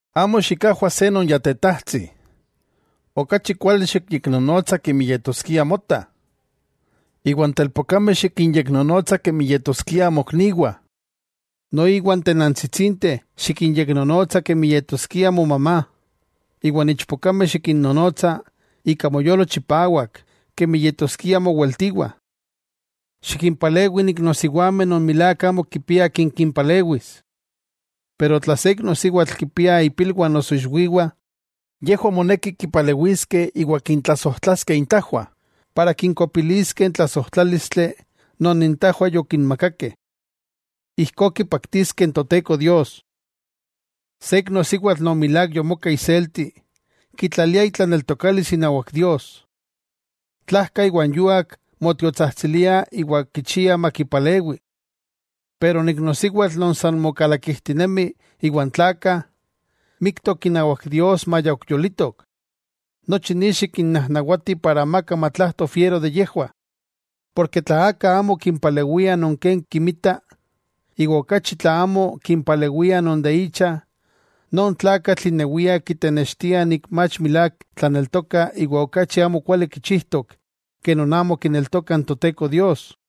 Amo xikajwa se non ya tetajtsi, okachi kuali xikyeknonotsa kemi yetoskia mota, iwan telpokameh xikinyeknonotsa kemi yetoskia mokniwah. Noiwa n tenantsitsinteh xikinyeknonotsa kemi yetoskia mona, iwan ichpokameh xikinnonotsa ika moyolo chipawak kemi yetoskiah moweltiwah. Xikimpalewi n iknosiwameh non milák amo kipiah akin kimpalewis. Pero tla se iknosiwatl kimpia ipilwah noso ixwiwah, yejwah moneki kipalewiskeh iwa kintlasojtlaskeh intajwah, ijkó kinkopiliskeh n tlasojtlálistli non intajwah yokinmakakeh. Ijkó kipaktiskeh n Toteko Dios. Se iknosiwatl non milák yomoka iselti, kitlalia itlaneltokalis inawak Dios, tlajka iwa n yuak motiotsajtsilia iwa kichia makipalewi. Pero n iknosiwatl non san mokalakijtinemi iwan tlakah, miktok inawak Dios maya ok yolitok. Nochi ni xikinnajnawati para amaka fiero makintenewah. Porke tla aka amo kimpalewia non ken kimita, iwa okachi tla amo kimpalewia non de icha, non tlakatl inewia kitenextia mach milák tlaneltoka iwa okachi amokuali kichijtok ke non amo kineltokah n Toteko Dios.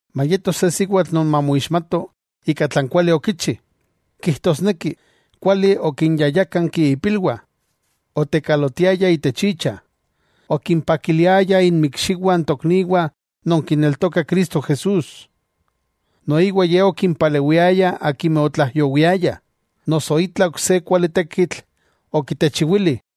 Mayeto se siwatl non mamoixmato ika tlan kuali okichi, kijtosneki, kuali okinyayákanki ipilwah, otekalotiaya icha, okimpakiliaya inmikxiwah n tokniwah non kineltokah Cristo Jesús. Noiwa ye okimpalewiaya akimeh otlaijyowiayah, noso itla ok se kuali tekitl okitechiwili.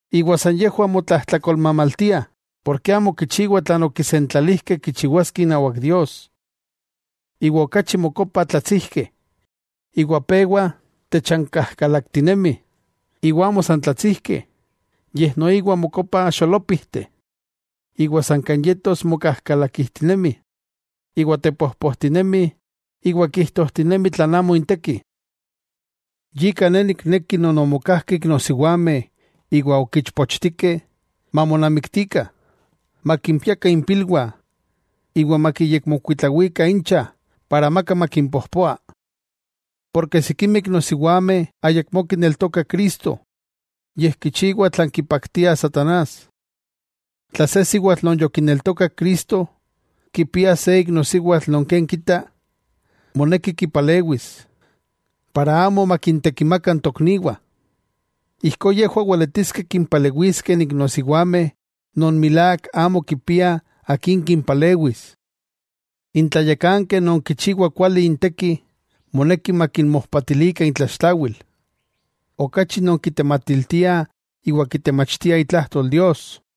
ijkó san yejwah motlajtlakolmamaltiah porke amo kichiwah tlan okisentlalijkeh kichiwaskeh inawak Dios. Iwa okachi mokopah tlatsijkeh iwa pewah techankajkalaktinemih, iwa amo san tlatsijkeh, yej noiwa mokopah xolópijteh, iwa san kan yetos mokajkalakijtinemih iwa tepojpojtinemih iwa kijtojtinemih tlan amo inteki. Yika ne nikneki non omokajkeh iknosiwameh iwa ok ichpochtikeh, mamonamiktikah, makimpiakah impilwah, iwa makiyekmokuitlawikah incha para amaka makimpojpoa. Porke sikimeh iknosiwameh ayakmó kineltokah Cristo yej kichiwah tlan kipaktia satanás. Tla se siwatl non yokineltokak Cristo, kipia se iknosiwatl non ken kita, moneki kipalewis, para amo makintekimaka n tokniwah. Ijkó yejwah weletiskeh kimpalewiskeh n iknosiwameh non milák amo kipiah akin kimpalewis. N tlayakankeh non kichiwa kuali inteki, moneki okachi makintlakitakah. Okachi non kitematiltiah iwa kitemachtiah itlajtol Dios.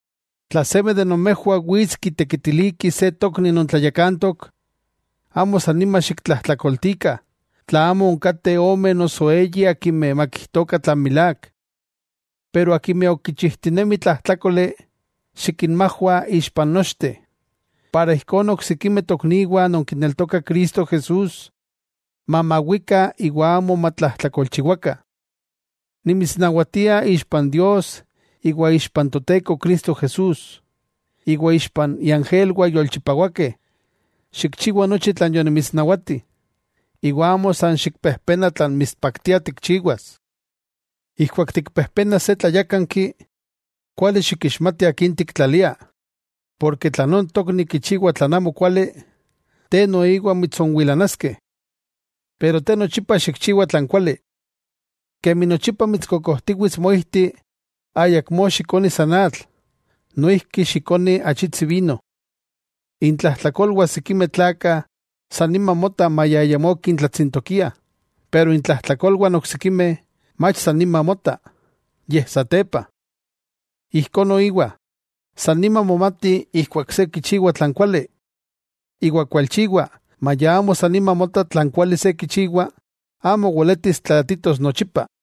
Tla seme de nomejwah wits kiteiliki se tokni non tlayakantok, amo san nima xiktlajtlakoltikah tla amo onkateh ome noso eyi akimeh makijtokah tlan milák. Pero akimeh ok kichijtinemih tlajtlákoli, xikinmajwa ixpa n nochteh, ijkó n oksikimeh tokniwah non kineltokah Cristo Jesús mamawikah iwa amo matlajtlakolchiwakah. Nimitsnawatia ixpa n Dios, ixpa n Toteko Cristo Jesús, iwa ixpa iangelwah yolchipawakeh, xikchiwa nochi tlan yonimitsnawati, iwa amo san xikpejpena tlan mitspaktia tikchiwas. Ijkuak tikpejpenas se tlayákanki, kuali xikixmati akin tiktlalia, porke tla non tokni kichiwa tlan amo kuali, te noiwa mitsonwilanaskeh. Te nochipa xikchiwa tlan kuali. Kemi nochipa mitskokojtiwits moijti, ayakmó xikoni san atl, noijki xikoni achitsi vino. Intlajtlakolwah sikimeh tlakah san nima motah maya ayamó kintlatsintokiah, pero intlajtlakolwah n oksikimeh, mach niman motah, yej satepa. Ijkó noiwa, san nima momati ijkuak se kichiwa tlan kuali, iwa kualchiwa maya amo san nima mota tlan kuali se kichiwa, amo weletis tlaatitos nochipa.